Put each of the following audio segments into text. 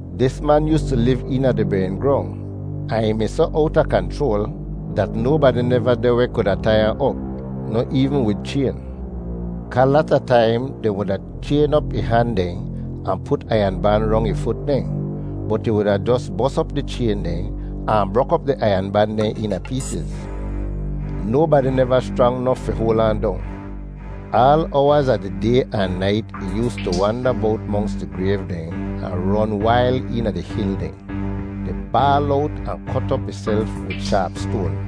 Dis man yoostu liv eena di bering grong ahn ih mi soh owta kanchroal dat nobadi neva deh weh kuda tai ahn op, noh eevn wid chayn. Kaa lata taim dehn wuda chayn op ih han dehn ahn put aiyan ban rong ih fut dehn, bot ih wuda jos bos op di chayn dehn ahn brok op di aiyan ban dehn eena peesiz. Nobadi neva schrang nof fi hoal ahn dong. Aal owaz a di day ahn nait ih yoostu wanda bowt monks di grayv dehn ahn ron wail eena di hil dehn, di baal owt ahn kot op ihself wid shaap stoan.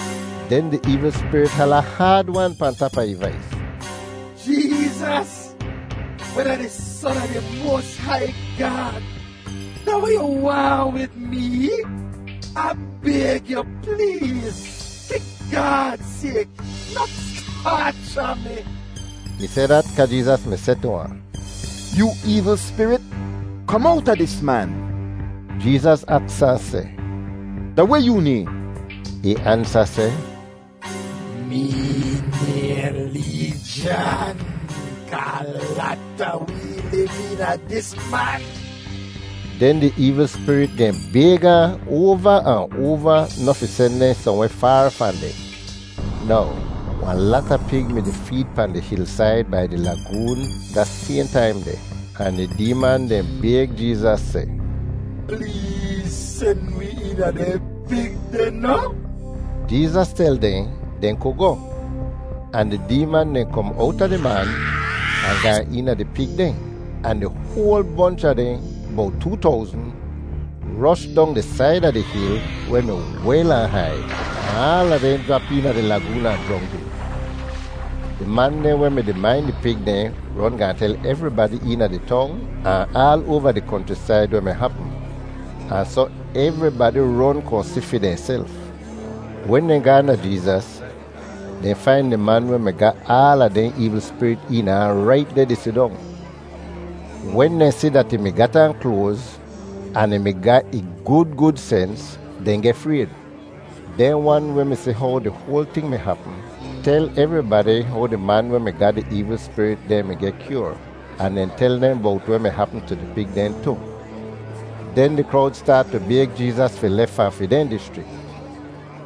Den di eevl spirit hala haad-wan pahn tap a ih vais, “Jeezas, weh da di Son a di moas hai Gaad, da weh yoo waahn wid mee? Ah bayg yu pleez, fi Gaad sayk, noh taacha mi!” Ih seh dat kaa Jeezas mi seh tu ahn, “Yoo eevl spirit, kom owta dis man!” Jeezas aks ahn seh, “Da weh yoo nayhn?” Ih ansa seh, “Mee nayhn Leejan kaa lata wee liv eena dis man.” Den di eevl spirit dehn bayg ahn oava ahn oava noh fi sen dehn sohnweh faar fahn deh. Now, wahn lata pig mi-di feed pahn di hilsaid bai di lagoon da sayhn taim deh, ahn di deeman dehn bayg Jeezas seh, “Pleez sen wi eena dehn pig deh noh?” Jeezas tel dehn dehn ku goh, ahn di deeman dehn kom owta di man ahn gaan eena di pig dehn, ahn di hoal bonch a dehn, bowt too towzn, rosh dong di said a di hil weh mi wel ahn hai, ahn aala dehn jrap eena di lagoon ahn jrongdid. Di man dehn weh mi-di main di pig dehn ron gaahn tel evribadi eena di tong ahn aal oava di konchrisaid weh mi hapm, ahn soh evribadi ron kohn si fi dehnself. Wen dehn gaahn da Jeezas, dehn fain di man weh mi ga aala dehn eevl spirit eena ahn rait deh di sidong. Wen dehn si dat ih mi gat aan kloaz, ahn ih mi ga ih gud gud sens, dehn geh frayd. Dehn wan weh mi si how di hoal ting mi hapm tel evribadi how di man weh mi ga di eevl spirit dehn mi geh kyoar, ahn dehn tel dehn bowt weh mi hapm tu di pig dehn tu. Den di krowd staat tu bayg Jeezas fi lef fahn fi dehn dischrik.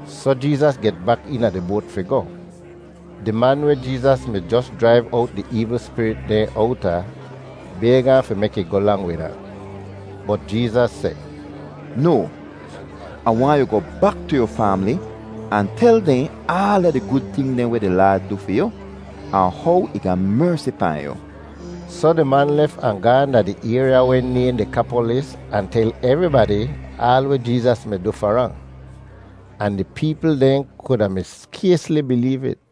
Soh Jeezas get bak eena di boat fi goh. Di man weh Jeezas mi jos jraiv owt di eevl spirit dehn owta bayg ahn fi mek ih goh lang wid ahn. Bot Jeezas seh, “No, Ah waahn yu goh bak tu yu faamli ahn tel dehn aala di gud ting dehn weh di Laad du fi yu ahn how ih ga mersi pahn yu.” Soh di man lef ahn gaahn da di ayrya weh nayhn Dekapolis ahn tel evribadi aal weh Jeezas mi du far ahn, ahn di peepl dehn kuda mi skaysli bileev it.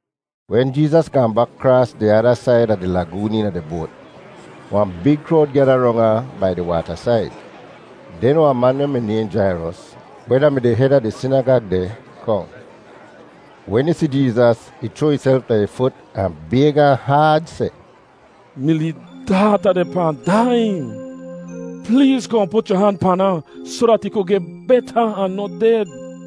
Wen Jeezas gaahn bak kraas di ada said a di lagoon eena di boat, wahn big krowd gyada rong ahn bai di waatasaid. Den wahn man weh mi nayhn Jairos, weh da-mi di hed a di sinagag deh, kohn. Wen ih si Jeezas, ih chroa ihself da ih fut ahn bayg ahn haad seh, “Mi lee daata deh pahn daiyin. Pleez kohn put yu han pan ahn soh dat ih ku geh beta ahn noh ded.”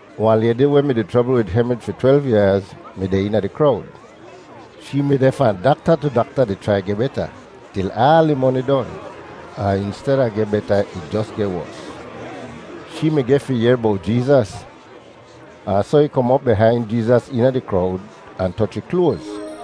Wahn laydi weh mi-di chrobl wid hemrij fi twelv yaaz mi deh eena di krowd. Shee mi deh fahn dakta tu dakta di chrai geh beta til aal ih moni don, ahn insteda geh beta ih jos geh wos. Shee mi geh fi yehr bowt Jeezas. Ahn soh ih kom op bihain Jeezas eena di krowd ahn toch ih kloaz,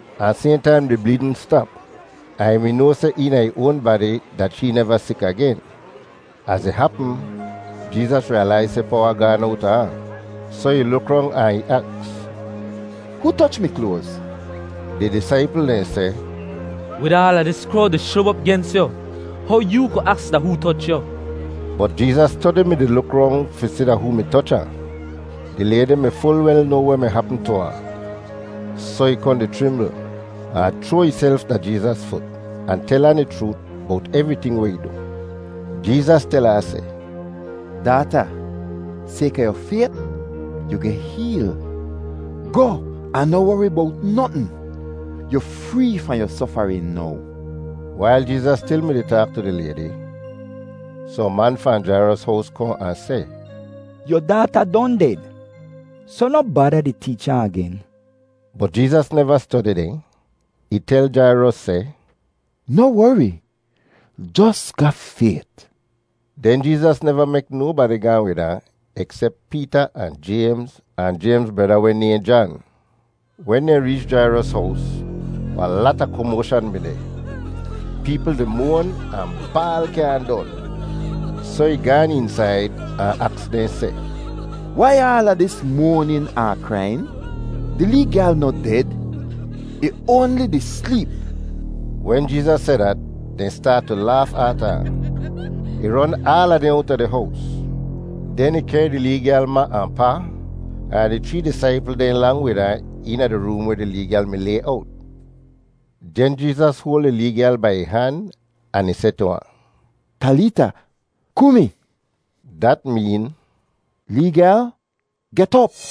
Ahn sayhn taim di bleedn stap, ahn ih mi noa seh eena ih oan badi dat shee neva sik agen. Az ih hapm, Jeezas riyalaiz seh powa gaan owta ahn, soh ih luk rong ahn ih aks, “Hoo toch mi kloaz?” Di disaipl dehn seh, “Wid aala dis krowd di shub op gens yu, how yoo ku aks da hoo toch yu?” Bot Jeezas stodi mi-di luk rong fi si da hoo mi toch ahn. Di laydi mi ful wel noa weh mi hapm tu ahn, soh ih kohn di chrimbl ahn chroa ihself da Jeezas fut ahn tel ahn di chroot bowt evriting weh ih du. Jeezas tel ahn seh, “Daata, sayka yu fayt, yu geh heel. Goh ahn noh wori bowt notn. Yu free fahn yu sofarin now.” Wail Jeezas stil mi-di taak tu di laydi, sohn man fahn Jairos hows kohn ahn seh, “Yu daata don ded, soh noh bada di teecha agen.” Bot Jeezas neva stodi dehn; ih tel Jairos seh, “Noh wori, jos ga fayt.” Den Jeezas neva mek nobadi gaahn wid ahn eksep Peeta ahn Jaymz, ahn Jaymz breda weh nayhn Jan. Wen dehn reech Jairos hows, wahn lata komoashan mi deh. Peepl di moan ahn baal kyaahn don! Soh ih gaan eensaid ahn aks dehn seh, “Wai aala dis moanin ahn kraiyin? Di lee gyal noh ded; ih oanli di sleep!” Wen Jeezas seh dat, dehn staat tu laaf aata ahn. Ih ron aala dehn owta di hows, den ih kehr di lee gyal ma ahn pa, ahn di chree disaipl dehn lang wid ahn eena di room weh di lee gyal mi lay owt. Den Jeezas hoal di lee gyal bai ih han ahn ih seh tu ahn, “Talita Kumi.” Dat meen “Lee gyal, get op!”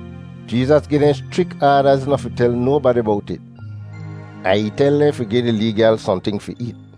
Jeezas gi dehn schrik aadaz noh fi tel nobadi bowt it, ahn ih tel dehn fi gi di lee gyal sohnting fi eet.